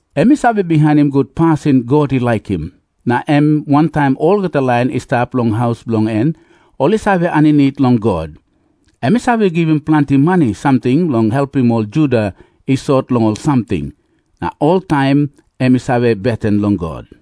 Em i save bihainim gut pasin God i laikim. Na em wantaim olgeta lain i stap long haus bilong en ol i save aninit long God. Em i save givim planti mani samting bilong helpim ol Juda i sot long ol samting. Na oltaim em i save beten long God.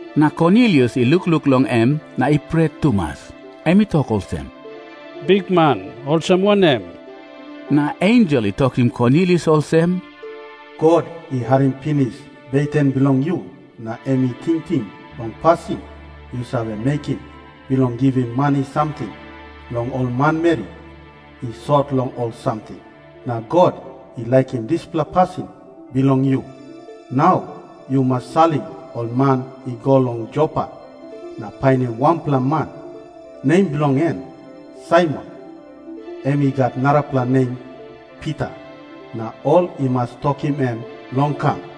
Na Kornilius i lukluk long em na i pret tumas. Em i tok olsem, "Bikman, olsem wanem?" Na ensel i tokim Kornilius olsem, "God i harim pinis beten bilong yu na em i tingting long pasin yu save mekim bilong givim mani samting long ol manmeri i sot long ol samting. Na God i laikim dispela pasin bilong yu. Nau yu mas salim ol man i go long Jopa na painim wanpela man, nem bilong en Saimon, em i gat narapela nem Pita. Na ol i mas tokim em long kam.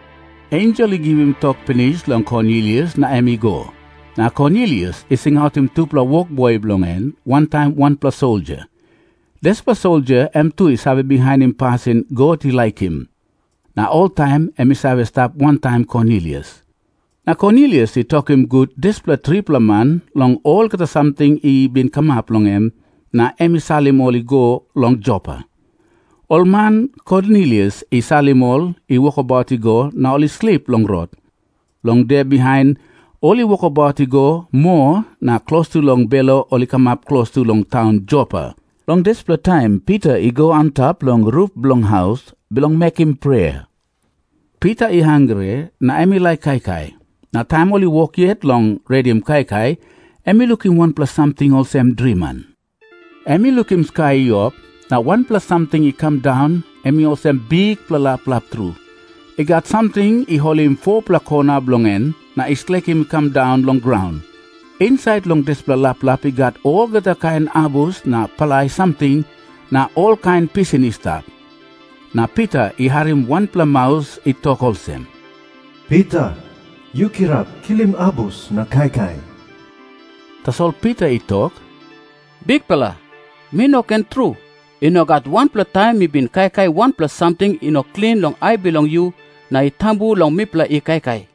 Ensel i givim tok pinis long Kornilius na em i go. Na Kornilius i singautim tupela wokboi bilong en wantaim wanpela soldia. Dispela soldia em tu i save bihainim pasin God i laikim, na oltaim em i save stap wantaim Kornilius. Na Kornilius i tokim gut dispela tripela man long olgeta samting i bin kamap long en, na em i salim ol i go long Jopa. Ol man Kornilius i salim, ol i wokabaut i go na ol i slip long rot. Long de bihain ol i wokabaut i go moa na klostu long belo ol i kamap klostu long taun Jopa. Long dispela taim Pita i go antap long rup bilong haus, bilong mekim prea. Pita i hangre na em i laik kaikai. Na taim ol i wok yet long redim kaikai, em i lukim wanpela samting olsem driman. Em i lukim skai i op, na wanpela samting i kam daun, em i olsem bikpela laplap tru. I gat samting i holim 4-pela kona bilong en na i slekim i kam daun long graun. Insait long dispela laplap i gat olgeta kain abus na palai samting na na olkain pisin i stap. Na Pita i harim wanpela maus i tok olsem, "Pita, yu kirap kilim abus na kaikai." Tasol Pita i tok, "Bikpela, mi no ken tru! I no gat wanpela taim mi bin kaikai wanpela samting i no klin long ai bilong yu na i tambu long mipela i kaikai."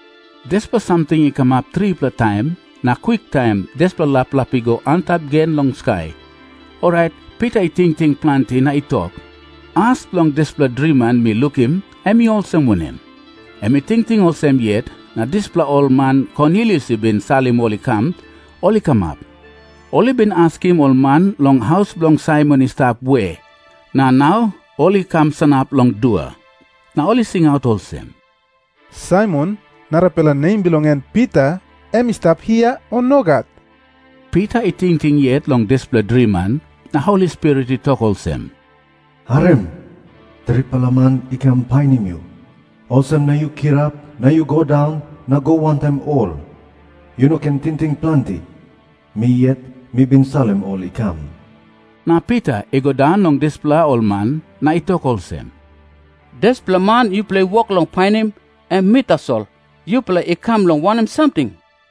Dispela samting i kamap tripela taim, na kwiktaim dispela laplap i go antap gen long skai. Orait Pita i tingting planti na i tok, "As bilong dispela driman mi lukim, em i olsem wanem?" Em i tingting olsem yet, na dispela ol man Kornilius i bin salim ol i kam, ol i kamap. Ol i bin askim ol man long haus bilong Saimon i stap we, na nau ol i kam sanap long dua. Na ol i singaut olsem, "Saimon, narapela nem bilong en Pita, em i stap hia, o nogat?" Pita i tingting yet long dispela driman, na Holi Spirit i tok olsem, "Harim. Tripela man i kam painim yu. Olsem na yu kirap na yu go daun na go wantaim ol. Yu no ken tingting planti. Mi yet mi bin salim ol i kam." Na Pita i go daun long dispela ol man, na i tok olsem, "Dispela man yupela i wok long painim, em mi tasol. Yupela i kam long wanem samting?"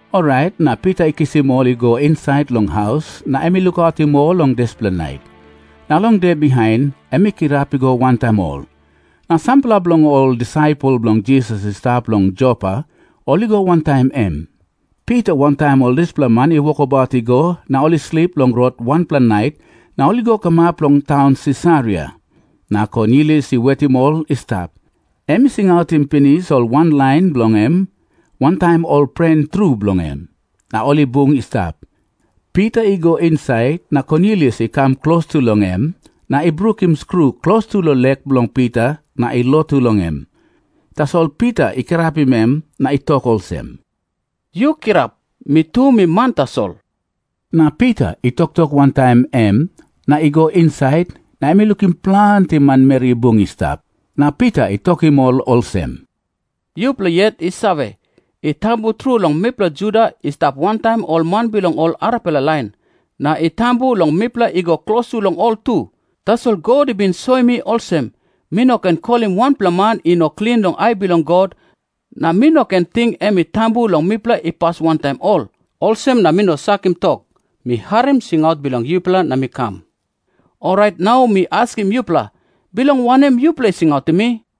Orait na Pita i kisim ol i go insait long haus na em i lukautim ol long dispela nait. Na long de bihain em i kirap i go wantaim ol. Na sampela bilong ol disaipel bilong Jisas i stap long Jopa ol i go wantaim em. Pita wantaim ol dispela man i wokabaut i go, na ol i slip long rot wanpela nait, na ol i go kamap long taun Sisaria. Na Kornilius i wetim ol i stap. Em i singautim pinis ol wanlain bilong en wantaim ol pren tru bilong en, na ol i bung i stap. Pita i go insait, na Kornilius i kam klostu long em na i brukim skru klostu long lek bilong Pita na i lotu long em. Tasol Pita i kirapim em na i tok olsem, "Yu kirap. Mi tu mi man tasol." Na Pita i toktok wantaim em na i go insait, na em i lukim planti manmeri i bung i stap. Na Pita i tokim ol olsem, "Yupela yet i save, i tambu tru long mipela Juda i stap wantaim ol man bilong ol arapela lain. Na i tambu long mipela i go klostu long ol tu. Tasol God i bin soim mi olsem, mi no ken kolim wanpela man i no klin long ai bilong God, na mi no ken ting em i tambu long mipela i pas wantaim ol. Olsem na mi no sakim tok. Mi harim singaut bilong yupela na mi kam. Orait nau mi askim yupela, bilong wanem yupela i singautim mi?"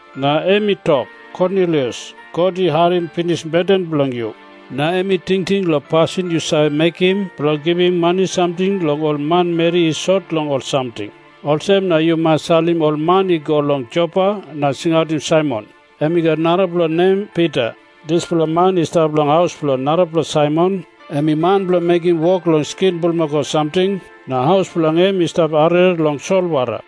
Na em i tok, 'Kornilius, God i harim pinis beten bilong yu, na em i tingting long pasin yu save mekim bilong givim mani samting long ol manmeri i sot long ol samting. Olsem na yu mas salim ol man i go long Jopa na singautim Saimon, em i gat narapela nem Pita. Dispela man i stap long haus bilong narapela Saimon, em i man bilong mekim wok long skin bulmakau samting, na haus bilong en i stap arere long solwara.'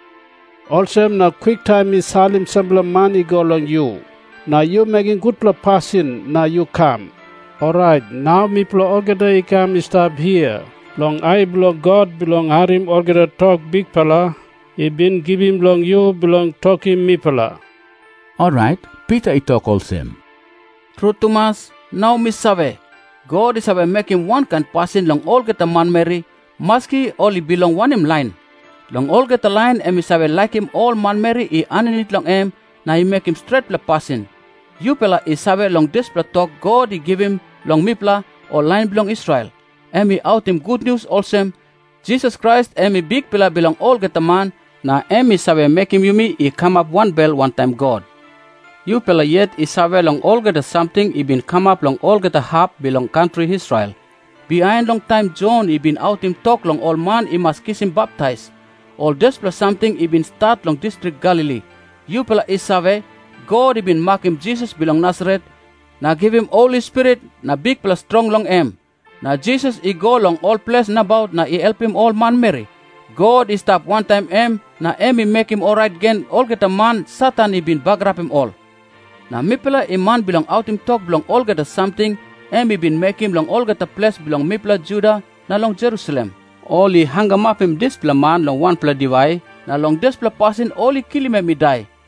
Olsem na kwiktaim mi salim sampela man i go long yu. Na yu mekim gutpela pasin na yu kam. Orait nau mipela olgeta i kam i stap hia long ai bilong God bilong harim olgeta tok Bikpela i bin givim long yu bilong tokim mipela." Orait Pita i tok olsem, "Tru tumas, nau mi save, God i save mekim wankain pasin long olgeta manmeri, maski ol i bilong wanem lain. Long olgeta lain em i save laikim ol manmeri i aninit long em na i mekim stretpela pasin. Yupela i save long dispela tok God i givim long mipela ol lain bilong Israel. Em i autim gutnius olsem, Jisas Krais em i Bikpela bilong olgeta man, na em i save mekim yumi i kamap wanbel wantaim God. Yupela yet i save long olgeta samting i bin kamap long olgeta hap bilong kantri Israel bihain long taim Jon i bin autim tok long ol man i mas kisim baptais. Ol dispela samting i bin stat long distrik Galili. Yupela i save, God i bin makim Jisas bilong Nasaret, na givim Holi Spirit na bikpela strong long em. Na Jisas i go long ol ples nabaut na i helpim ol manmeri. God i stap wantaim em na em i mekim orait gen olgeta man Satan i bin bagarapim ol. Na mipela i man bilong autim tok bilong olgeta samting em i bin mekim long olgeta ples bilong mipela Juda na long Jerusalem. Ol i hangamapim dispela man long wanpela diwai, na long dispela pasin ol i kilim em i dai.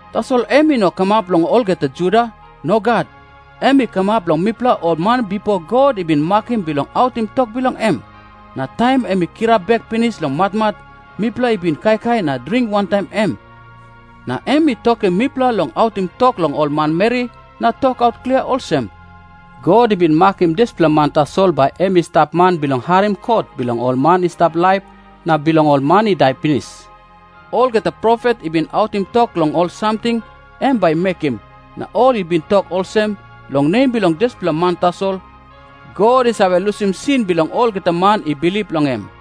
Tasol em i no kamap long olgeta Juda. Nogat. Em i kamap long mipela ol man bipo God i bin makim bilong autim tok bilong em. Na taim em i kirap bek pinis long matmat, mipela i bin kaikai na dring wantaim em. Na em i tokim mipela long autim tok long ol manmeri na tokaut klia olsem, 'God i bin makim dispela man tasol bai em i stap man bilong harim kot bilong ol man i stap laip na bilong ol man i dai pinis.' Olgeta profet i bin autim tok long ol samting em bai i mekim, na ol i bin tok olsem, long nem bilong dispela man tasol, God i save lusim sin bilong olgeta man i bilip long em."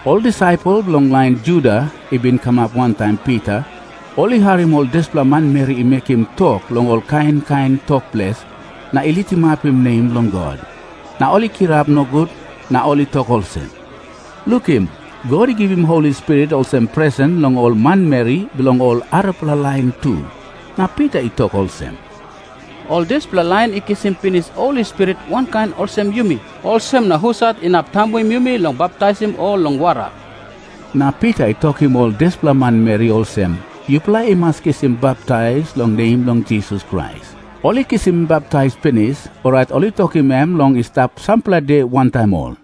Ol disaipel bilong lain Juda i bin kam wantaim Pita, ol i harim ol dispela manmeri i mekim tok long ol kain kain tok ples na i litimapim nem bilong God, na ol i kirap nogut na ol i tok olsem, "Lukim. God i givim Holi Spirit olsem presen long ol manmeri bilong ol arapela lain tu." Na Pita i tok olsem, "Ol dispela lain i kisim pinis Holi Spirit wankain olsem yumi. Olsem na husat inap tambuim yumi long baptaisim ol long wara?" Na Pita i tokim ol dispela manmeri olsem, "Yupela i mas kisim baptais long nem bilong Jisas Krais." Ol i kisim baptais pinis, orait ol i tokim em long i stap sampela de wantaim ol.